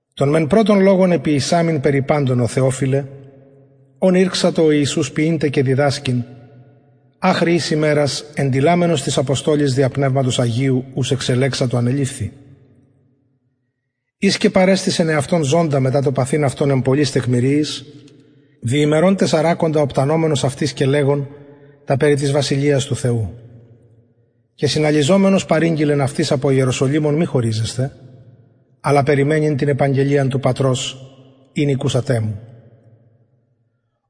τον μεν πρωτον λογον εποιησαμην περι παντων ω θεοφιλε ων ηρξατο ο ιησους ποιειν τε και διδασκειν αχρι ης ημερας εντειλαμενος τοις αποστολοις δια πνευματος αγιου ους εξελεξατο ανεληφθη οις και παρεστησεν εαυτον ζωντα μετα το παθειν αυτον εν πολλοις τεκμηριοις δι ημερων τεσσαρακοντα οπτανομενος αυτοις και λεγων τα περι της βασιλειας του θεου και συναλιζομενος παρηγγειλεν αυτοις απο ιεροσολυμων μη χωριζεσθαι αλλα περιμενειν την επαγγελιαν του πατρος ην ηκουσατε μου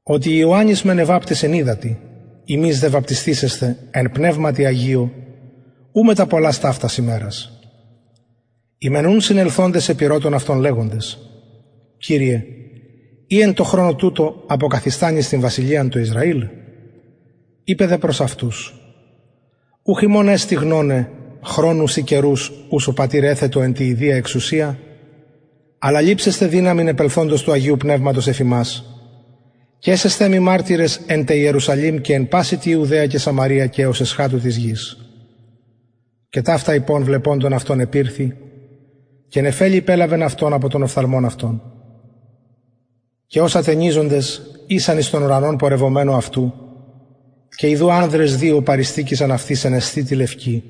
οτι ιωαννης μεν εβαπτισεν υδατι υμεις δε βαπτισθησεσθε εν πνευματι αγιω ου μετα πολλας ταυτας ημερας οι μεν ουν συνελθοντες επηρωτων αυτον λεγοντες κυριε ει εν τω χρονω τουτω αποκαθιστανεις την βασιλειαν τω ισραηλ ειπεν δε προς αυτους ουχ υμων εστιν γνωναι χρονους η καιρους ους ο πατηρ εθετο εν τη ιδια εξουσια αλλα ληψεσθε δυναμιν επελθοντος του αγιου πνευματος εφ υμας και εσεσθε μοι μαρτυρες εν τε ιερουσαλημ και εν παση τη ιουδαια και σαμαρεια και εως εσχατου της γης και ταυτα ειπων βλεποντων αυτων επηρθη και νεφελη υπελαβεν αυτον απο των οφθαλμων αυτων και ως ατενιζοντες ησαν εις τον ουρανον πορευομενου αυτου και ιδου ανδρες δυο παρειστηκεισαν αυτοις εν εσθητι λευκη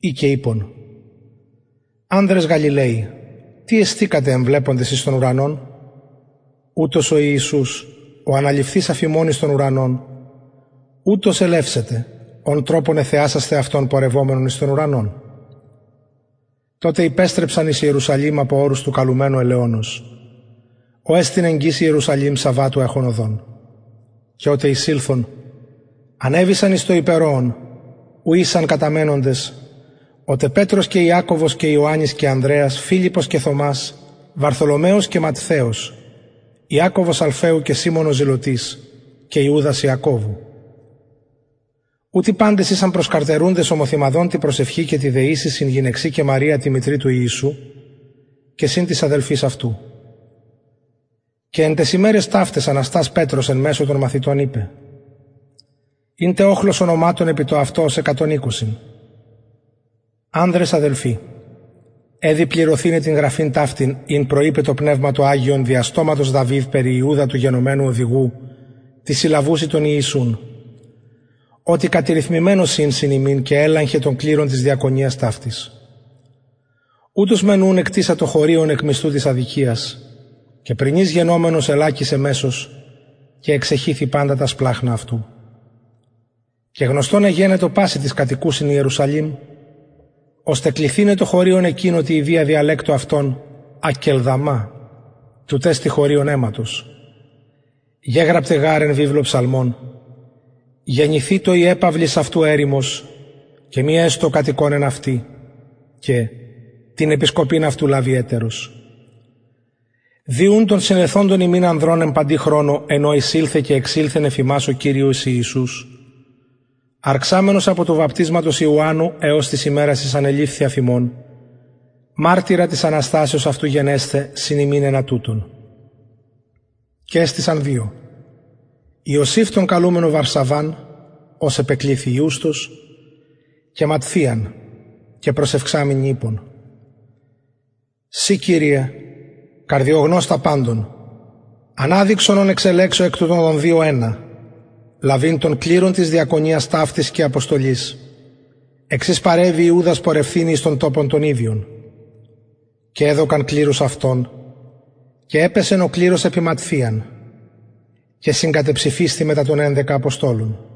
οι και ειπον ανδρες γαλιλαιοι τι εστηκατε εμβλεποντες εις τον ουρανον ουτος ο ιησους ο αναληφθεις αφ υμων εις τον ουρανον ουτως ελευσεται ον τροπον εθεασασθε αυτον πορευομενον εις τον ουρανον τοτε υπεστρεψαν εις ιερουσαλημ απο ορους του καλουμενου ελαιωνος ο εστιν εγγυς ιερουσαλημ σαββατου εχον οδον και οτε εισηλθον ανεβησαν εις το υπερωον ου ησαν καταμενοντες ο τε πετρος και ιακωβος και ιωαννης και ανδρεας φιλιππος και θωμας βαρθολομαιος και ματθαιος ιακωβος αλφαιου και σιμων ο ζηλωτης και ιουδας ιακωβου ουτοι παντες ησαν προσκαρτερουντες ομοθυμαδον τη προσευχη και τη δεησει συν γυναιξιν και μαρια τη μητρι του ιησου και συν τοις αδελφοις αυτου και εν ταις ημεραις ταυταις αναστας πετρος εν μεσω των μαθητων ειπεν ην τε οχλος ονοματων επι το αυτο ως εκατον εικοσι ανδρες αδελφοι εδει πληρωθηναι την γραφην ταυτην ην προειπεν το πνευμα το αγιον δια στοματος δαυιδ περι ιουδα του γενομενου οδηγου τοις συλλαβουσιν τον ιησουν οτι κατηριθμημενος ην συν ημιν και ελαχεν τον κληρον της διακονιας ταυτης ουτος μεν ουν εκτησατο χωριον εκ μισθου της αδικιας και πρηνης γενομενος ελακησεν μεσος και εξεχυθη παντα τα σπλαγχνα αυτου και γνωστον εγενετο πασιν τοις κατοικουσιν ιερουσαλημ ωστε κληθηναι το χωριον εκεινο τη ιδια διαλεκτω αυτων ακελδαμα τουτ εστιν χωριον αιματος γεγραπται γαρ εν βιβλω ψαλμων γενηθητω η επαυλις αυτου ερημος και μη εστω ο κατοικων εν αυτη και την επισκοπην αυτου λαβοι ετερος δει ουν των συνελθοντων ημιν ανδρων εν παντι χρονω εν ω εισηλθεν και εξηλθεν εφ ημας ο κυριος ιησους αρξαμενος απο του βαπτισματος ιωαννου εως της ημερας ης ανεληφθη αφ ημων μαρτυρα της αναστασεως αυτου γενεσθαι συν ημιν ενα τουτων και εστησαν δυο ιωσηφ τον καλουμενον βαρσαβαν ος επεκληθη ιουστος και ματθιαν και προσευξαμενοι ειπον συ κυριε καρδιογνωστα παντων αναδειξον ον εξελεξω εκ τουτων των δυο ενα λαβειν τον κληρον της διακονιας ταυτης και αποστολης εξ ης παρεβη ιουδας πορευθηναι εις τον τοπον τον ιδιον και εδωκαν κληρους αυτων και επεσεν ο κληρος επι ματθιαν και συγκατεψηφισθη μετα των ενδεκα αποστολων